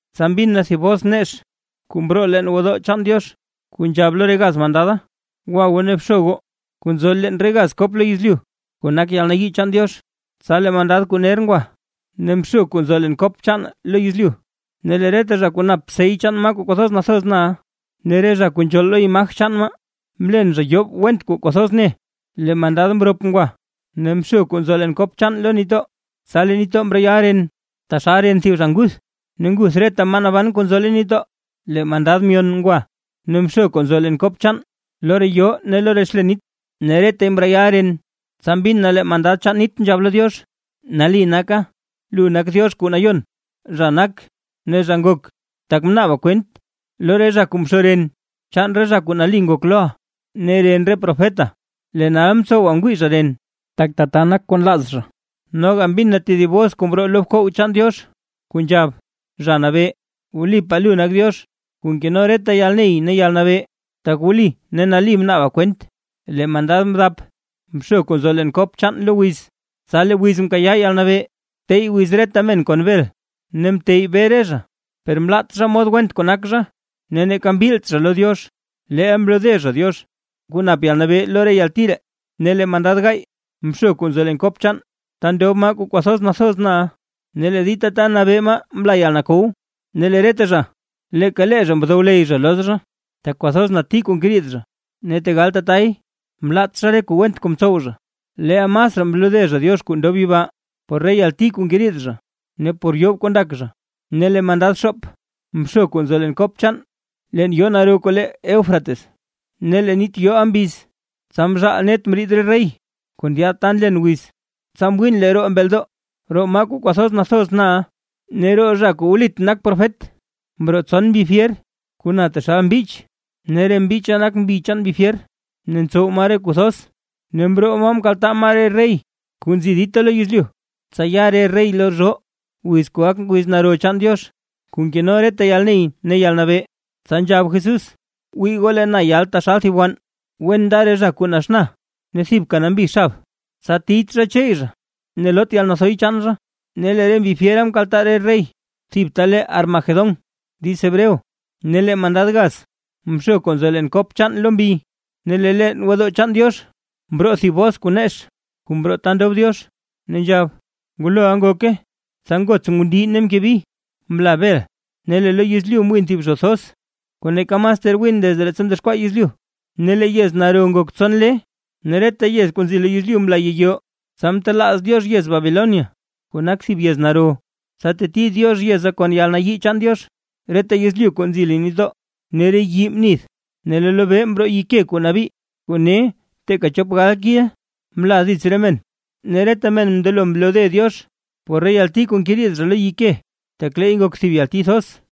Tsa mbin na thib bos nex, kuu mroo leen gwodoo chaan Diox, kuu nzhab lo re gaz mandada: ―Gwa goo ne bxo goo, kuu nzo leen re gaz kop lo yezlyu, kuu nak yalnayii chaan Diox. Tsa lee mandad kuu ner ngwa ne mxo kuu nzo leen kop chaan lo yezlyu, ne lee reta zha kuu nap sey chaan maa kuu kwathoz nathoz na, ne re zha kuu nzhool lo imaj chaan maa, mlen zha yoob went kuu kwathoz ne. Lee mandad mrop ngwa ne mxo kuu nzo leen kop chaan lo nitdoo, tsa lee nitdoo mreyal ren, taxal ren thib zha nguth, ne nguth reta maa naban kuu nzo leen nitdoo. Lee mandad myon ngwa ne mxo kuu nzo leen kop chaan lo re yoo ne lo re xlen nit, ne retay mreyal ren. Tsa mbin na lee mandad chaan nit nzhab lo Diox: ―Nali naka, lu nak Diox kuu Nayon, zha nak ne zha ngok, tak mnaaba kwent, lo re zha kuu mxo ren chaan re zha kuu nali ngok loʼa, ne ren re profeta, lee nal mtsowa ngwii zha ren; tak tata nak kuu nlaaz zha. Noga mbin na tedib bos kuu mroo lo bkoog chaan Diox, kuu nzhab: ―Zha Nabee, wlipaa lu nak Diox kuu nkeno reta yalney ne yalnabee; tak wli ne nali mnaaba kwent. Lee mandad mdap mxo kuu nzo leen kop chaan lo wiz; tsa lee wiz mkayaa yalnabee tey wiz reta men kon bel. Ne mteyy bee re zha, per mlaat zha mod went kuu nak zha ne neeka mbilt zha lo Diox, leel mlode zha Diox kuu nap yalnabee lo re yalti ree. Ne lee mandad gaay mxo kuu nzo leen kop chaan ta ndob maa kuu nathoz na, ne lee dita ta nabee maa mla yalkow. Ne lee reta zha leeka lee zha mndowley zha loz zha, tak kwathoz nati kuu ngeriid zha; ne tegal tatay mlaat zha re kuu went kuu mtsow zha, leel masraa mlode zha Diox kuu ndob yibaa, por re yalti kuu ngeriid zha ne por yoob kuu ndak zha. Ne lee mandad xoop mxo kuu nzo leen kop chaan leen yoo naro kuu le Eufrates, ne lee nit yooʼa mbiz, tsa mzhaal net mriid re rey kuu ndyaad lad ta nlen wiz. Tsa mwiin lee roo mbeldoo, roo maa kuu kwathoz nathoz na ne roo zha kuu wlit nak profet, mroo tson mbi fyer kuu na taxal mbich. Ne re mbicha nak mbi chaan mbi fyer, ne ntsow maa re kuu thoz, ne mroo maa mkaltaa maa re rey kuu nzi dita lo yezlyu, tsa ya re rey lo zhoo, wiz kuu gak wiz naro chaan Diox kuu nkeno reta yalney ne yalnabee. Tsa nzhab Jesús: ―Wii goo lee na yal taxal thib wann. Wen nda re zha kuu naxna ne thibka nambi na xab, tsa tiyt zha cheey zha, ne loot yalnathoy chaan zha. Ne lee re mbi fyera mkaltaa re rey thib ta le Armagedón diiz hebreo. Ne lee mandad gaz mxo kuu nzo leen kop chaan lo mbi; ne lee leen gwodoo chaan Diox mroo thib bos nex kuu mroo ta ndob Diox, ne nzhab: ―¡Nguloʼa ngoke! Tsa ngots ngundii ne mke bi, mla bel ne lee lo yezlyu mwin thib zho thoz, kuu neeka mas ter win desde leettsa mdexkwaa yezlyu. Ne lee yez naro ngok tson lee ne lee reta yez kuu nzi lo yezlyu mla yiyoo. Tsa mtelaaz Diox yez Babilonia, kuu nak thib yez naro, tsa teti Diox yeza kon yalnayii chaan Diox. Reta yezlyu kuu nzi leen nitdoo ne re yii mnith. Ne lee lobee mroo yike nabii kuu ne teeka chop gal kil mla dits re men, ne reta men mndelo mlode Diox por re yalti kuu ngeriid zha lo yike, tak leey ngok thib yalti thoz.